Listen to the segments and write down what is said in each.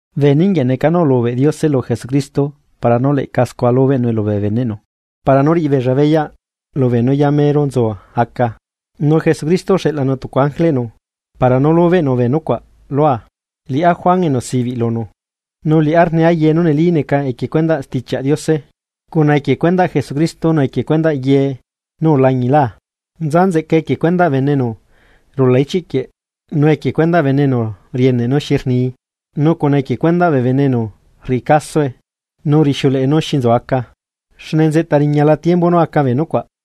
Bee ninguieꞌ neca nú ulubeꞌ Diose lu Jesucristo para nú leꞌca scua lubeꞌnue lubee beneꞌnu, para nú riꞌi beella beyaꞌ lubee nú yamero nzu aca. Nu Jesucristo uxeꞌlanu tucu ángeleꞌnu para nú lubeꞌnu bee nucuaꞌ lua, liꞌá Juan enu sibiꞌ lunu, nu liꞌá rniá ye nú neli neca equie cuendaꞌ Stichiaꞌ Diose, cuna equie cuendaꞌ Jesucristo nu equie cuendaꞌ ye nú ulañilaa. Nza nzeꞌcae equie cuendaꞌ bene enu rula ichiꞌ quieꞌ nu equie cuendaꞌ bee bene enu rieneꞌ nú xi rnii nu cuna equie cuendaꞌ bee bene enu rriꞌi casoe, nu rixiuleꞌe nú xi nzu aca, xne nzeꞌta riñala tiembu nú aca bee nucuaꞌ.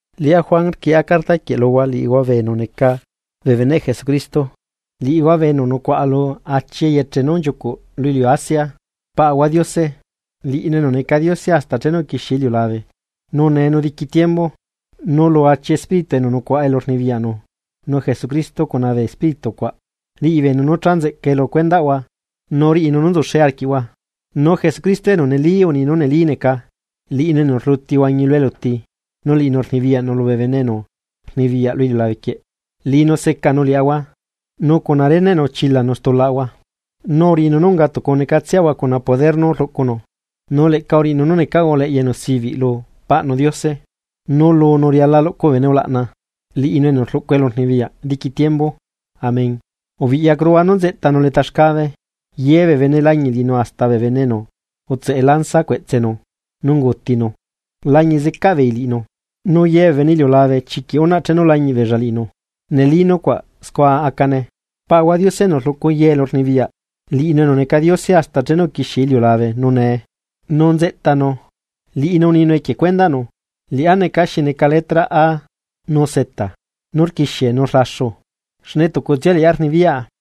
Liꞌá Juan rquieꞌa carta quieꞌ luhua liꞌihua bee enu neca bee beneꞌ Jesucristo, liꞌihua bee enu nucuaꞌa lu achi eyeche nú nchiucuꞌ lu iliu Asia. Paꞌahua Diose, liꞌinu enu neca Diose hasta chenu uquixie iliulabe, nu nee nu diqui tiembu. Nu lu achi espíritu enu nucuaꞌa elu rnibiyaꞌnu nu Jesucristo cuna bee espíritu cuaꞌ riꞌi beenu nú cha nzeꞌcae lu cuendaꞌhua nu riꞌinu nú nzuxe arquiꞌhua. Nu Jesucristo enu neli uni nú neli neca, liꞌinu enu rluti uhuañi lu eluti nu liꞌinu rnibiyaꞌnu lubee bene enu rnibiyaꞌ lu iliulabequieꞌ. Liꞌinu secanu liaꞌahua nu cuna reneꞌnu uchilanu stulaꞌahua, nu uriꞌinu nú unga tucu necatseꞌahua cuna poder nú rluꞌcunu, nu leꞌca uriꞌinu nú necaꞌahua uleꞌya enu sibiꞌ lu Paꞌnu Diose. ¡Nu lunu riala luꞌcu bee bene ulaꞌna, liꞌinu enu rluꞌcu elurnibiyaꞌ diqui tiembu! Amén. ¡Ubiꞌyacuruhua nú nzeꞌtanu leta xcabe! Ye bee bene lañiꞌ liꞌinu hasta bee bene enu utseꞌe lanza cueꞌtsenu nú ungutinu lañiꞌ zecaꞌ beei liꞌinu, nu ye bee bene iliulabe chiquiꞌ unaꞌ chenu lañiꞌ beella liꞌinu, neli nucuaꞌ scua acane. Paꞌahua Diose enu rluꞌcu ye elurnibiyaꞌ, liꞌinu enu neca Diose hasta chenu uquixie iliulabe nu nee, nu nzeꞌtanu, liꞌinu uninu equie cuendaꞌnu: “Liꞌá neca xi neca letra A nu Z”, nú rquixie nu rlaxu, xne tucutsia liꞌá rnibiyaꞌa.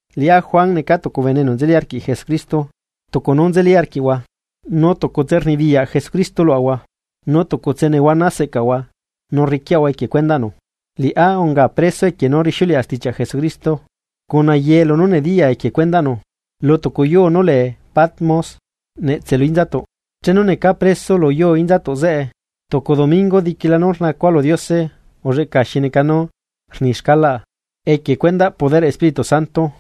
Liꞌá Juan neca tucu bene enu nzeli arquiꞌ Jesucristo tucu nú nzeli arquiꞌhua. Nu tucutse rnibiyaꞌ Jesucristo luaꞌahua, nu tucutse nehuana seꞌcaꞌahua nu rriquiaꞌahua equie cuendaꞌnu. Liꞌá unga preso equie nú rixiuleꞌa stichiaꞌ Jesucristo cuna ye lunú nediyaa equie cuendaꞌnu, lu tucu yuu nú lee Patmos netse lu inzatuꞌ. Chenu necaa preso lu yuu inzatuꞌ zeꞌe, tucu domingo diquila nú rnacua lu Diose ulleꞌca xi neca nú rni xcalaꞌa equie cuendaꞌ poderꞌ Espíritu Santo,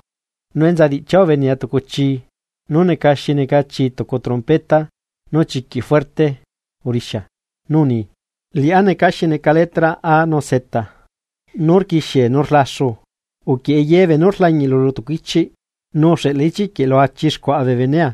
nu enza diꞌchia ubenea tucu chii nú neca xi neca chii tucu trompeta nú chiquiꞌ fuerte urixia, nú uni: ―Liꞌá neca xi neca letra A nu Z nú rquixie nú rlaxu uquieꞌe ye beenú rlañiꞌlu lu tucu ichiꞌ nu uxeꞌla ichiꞌ quieꞌ lu achi xcuaꞌa bee benea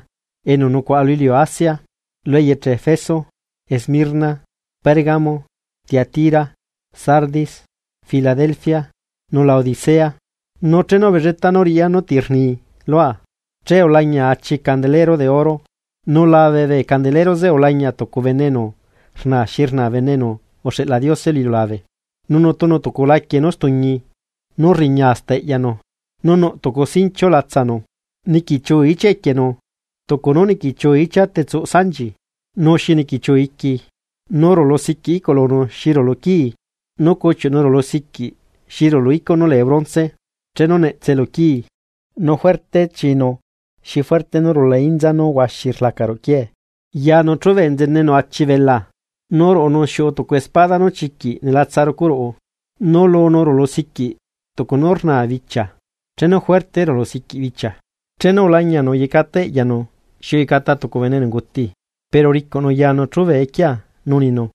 enu nucuaꞌa lu iliu Asia, lu eyeche Efeso, Esmirna, Pérgamo, Tiatira, Sardis, Filadelfia, nu Laodicea. Nu chenu ubelletaa nú riꞌya nú ti rni lua, che ulañia achi candelero de oro, nu labe bee candelero zeꞌe ulañia tucu bene enu rna xi rna bene enu uxeꞌla Diose lu iliulabe, nu nutunu tucu laquie nú stuñi nú rriña hasta eꞌyanu, nu nuꞌ tucu sinchiu latsanu. Niquichiu ichia equienu tucu nú niquichiu ichia tetsuꞌ sanchi nu xi niquichiu iqui, nu rulu siquiꞌ iꞌculunu xi rulu quii. Nu cuchiuꞌnu rulusiquiꞌ xi rulu icuꞌ nú lee bronce chenu netse lu quii, nu fuerte chinu xi fuerte nú rula inza nú huaxi rlaca ruꞌu quiee. Yanu chube nzenenu achi belaa, nu ruꞌunu xiuꞌu tucu espada nú chiquiꞌ nelatsa rucu ruꞌu, nu lunu rulusiquiꞌ tucu nú rnaa bichia chenu juerte rulusiquiꞌ bichia. Chenu ulañianu uyecata eꞌyanu xi uyecata tucu bene enu unguti. Pero uricuꞌnu yanu chube equia nu uninu: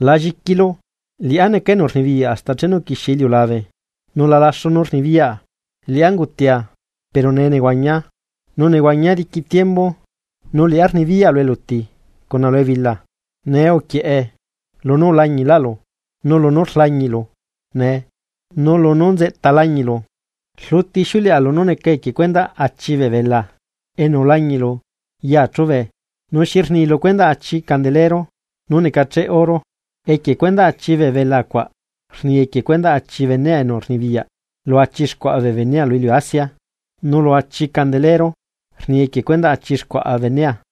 ―La lliquilu, liꞌá neca enu rnibiyaꞌ hasta chenu uquixie iliulabe nu lalaxu nú rnibiyaꞌa. Liꞌá ungutia, pero nee nehuañia, nu nehuañia diqui tiembu, nu liꞌá rnibiyaꞌa lu eluti cuna lu ebila. Nee uquieꞌe, lunú ulañiꞌlaꞌlu nu lunú rlañiꞌlu nee nu lunú nzeꞌta lañiꞌlu. Rluti ixiuleꞌa lunú neca equie cuendaꞌ achi bee belaa enu ulañiꞌlu yaa chube nu xi rni lu cuendaꞌ achi candelero nú necacheꞌ oro: Equie cuendaꞌ achi bee bela cuaꞌ rni equie cuendaꞌ achi bene enu rnibiyaꞌ lu achi xcuaꞌa bee benea lu iliu Asia, nu lu achi candelero rni equie cuendaꞌ achi xcuaꞌa bee benea.